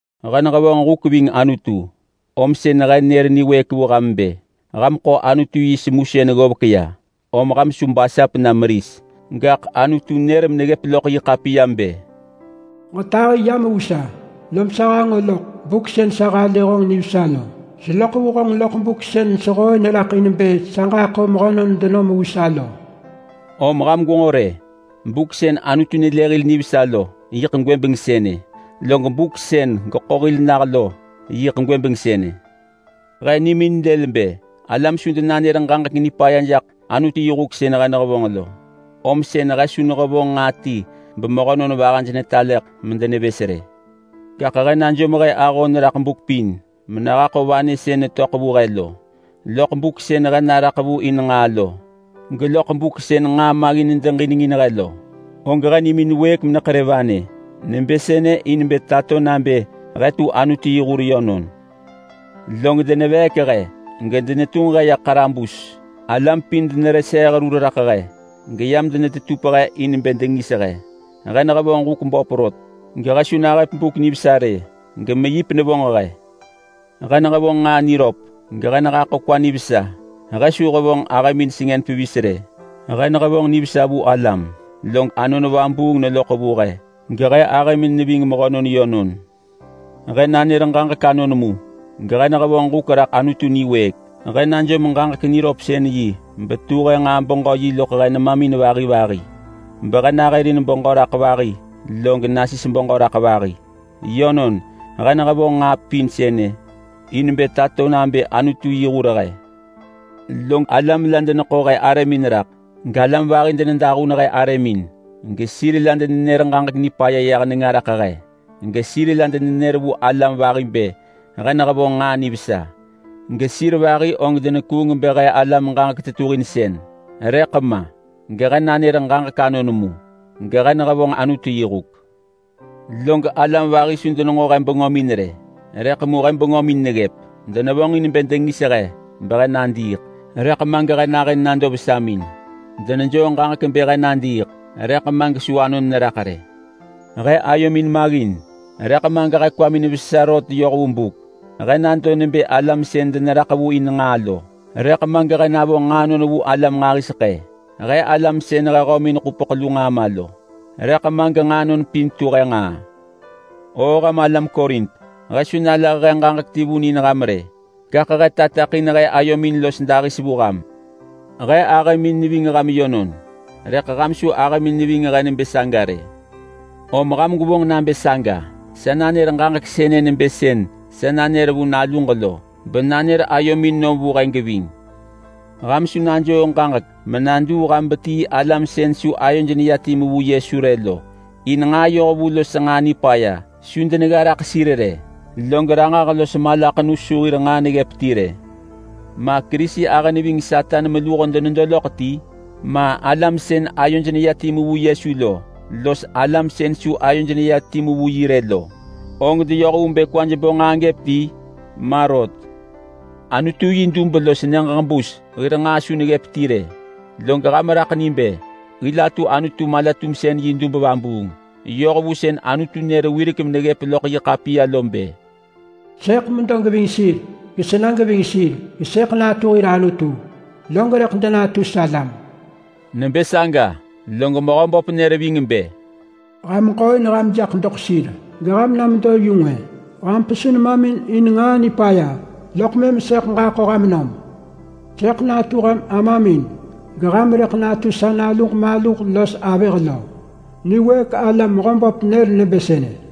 He nehevonġ huk ving Anutu om sën he nër niwëëk vu ham bë: Ham ḳo Anutu yi semusën ggovek ya om ham su basap na meris. Gaḳ Anutu nër meneggëp loḳ yi ḳapiya bë: “Ġetahi yam vu sa, lom sa hanġo loḳ buk sën sa halë honġ nivesa lo. Seloḳ vu honġ loḳ buk sën sehooin raḳ in bë sa ġaḳo mehönon denom vu sa lo.” Om ham gwenġo rë! Buk sën Anutu nelë hil nivesa lo yiḳ gwëbeng sënë, log buk sën geḳo hil nah lo yiḳ gwëbeng sënë. He nimin lël bë alam su denanër ġaġek nipaya jaḳ Anutu yi huk sën he nehevonġ lo, om sën he su nehevonġ nġaa ti bemehönon vahaj nelah loḳ medenevës rë. Gaḳ he najom he ahon raḳ buk pin menehaḳo vanë sën netöḳ vu he lo. Loḳ buk sën he naraḳ vu in nġaa lo, geloḳ buk sën nġaa maggin nedeġinengin he lo, og he nimin wëëk meneḳerë vanë nebë sënë in bë tato nabë he tu Anutu yi hur yönon. Log deneveek he gedenetunġ he ya ḳarabus. Alam pin denereseeh rur raḳ he, geyam denetetup he in bë dengis he. He nehevonġ huk böp rot gehe su nahëp buk nivesa rë, gemeyip nevonġ he. He nehevonġ nġaa niröp, gehe nehaḳo kwa nivesa. He su hevonġ ahëmin sengën pevis rë. He nehevonġ nivesa vu alam, log Anon Vabuung neloḳ vu he, gehe ahëmin neving mehönon yönon. He nanër ġaġek anon mu, gehe nehevonġ huk raḳ Anutu niwëëk. He najom ġaġek niröpsën-yi betu he nġaa-beġö-yi loḳ he nemamin vahi vahi, behe nahërin beġö raḳ vahi log nasis beġö raḳ vahi. Yönon, he nehevonġ nġaa pin sënë in bë tato nabë Anutu yi hur he. Log alam la deneḳo he arëmin raḳ, galam vahi denedahun he arëmin. Gesir la denenër ġaġek nipaya yah nenga raḳ he, gesir la denenër vu alam vahi bë he nehevonġ nġaa nivesa. Gesir vahi og denekuung bë he alam ġaġek tetuhinsën, rëḳ ma gehe nanër ġaġek anon mu, gehe nehevonġ Anutu yi huk. Log alam vahi su denenġo he bengömin rë, rëḳ mu he bengömin neggëp. Denevonġin bë dengis he behe nadiiḳ, rëḳ ma gehe nahën nado vesamin. Denejoo ġaġek bë he nadiiḳ, rëḳ ma gesu anon neraḳ rë. He ayomin maggin, rëḳ ma gehe kwamin vesa rot yoh vu buk. He nado nebë alam sën deneraḳ vu in nġaa lo, rëḳ ma gehe navo nġaanon vu alam nġahiseḳë. He alam sën he hömin ḳupeḳ lu nġaa ma lo, rëḳ ma genġaanon pin tu he nġaa. O ham alam Korint, he su nalah he ġaġek ti vun in ham rë gaḳ he tateḳin he ayomin los dahis vu ham. He ahëmin neving ham yönon, rëḳ ham su ahëmin neving he nebë saga rë. Om ham gwevonġ nabë saga—sa nanër ġaġek sënë nebë sën sa nanër vu naluġ lo—benanër ayomin nom vu he geving. Ham su najoo ġaġek menaduu ham betii alam sën su ayoj neya timu vu Yesu rë lo. In nġaa yohvu los nġaa nipaya su denegga raḳ sir rë, log ranġah los malaḳenu su hir nġaa neggëp ti rë. Ma Kerisi ahë neving Satan meluho denedo loḳ ti? Ma alam sën ayoj neya timu vu Yesu lo los alam sën su ayoj neya timu vu yi rë lo, og deyoh vu bë kwaj bo nġaa gëp ti? Ma rot! Anutu yi dub los nyëġ ġebus hir nġaa su neggëp ti rë, log ham raḳ ni bë hil atu Anutu mala-tumsën yi dub vabuung yoh vu sën Anutu nër wirek meneggëp loḳ yi ḳapiya lo bë, “Sëḳ medo geving sir gesena geving sir. Gesëḳ natu hir Anutu, log rëḳ denatu salam.” Nebë saga log Mehöböp nër ving bë: “Ham ġooin ham jaḳ doḳ sir geham na medo yu ngwë. Ham pesu nemamin in nġaa nipaya, loḳ mëm sëḳ ġaḳo ham nom.” “Sëḳ natu ham amamin geham rëḳ natu sa naluġ maluh los avëh lo. Niwëëk ala Mehöböp nër nebë sënë.”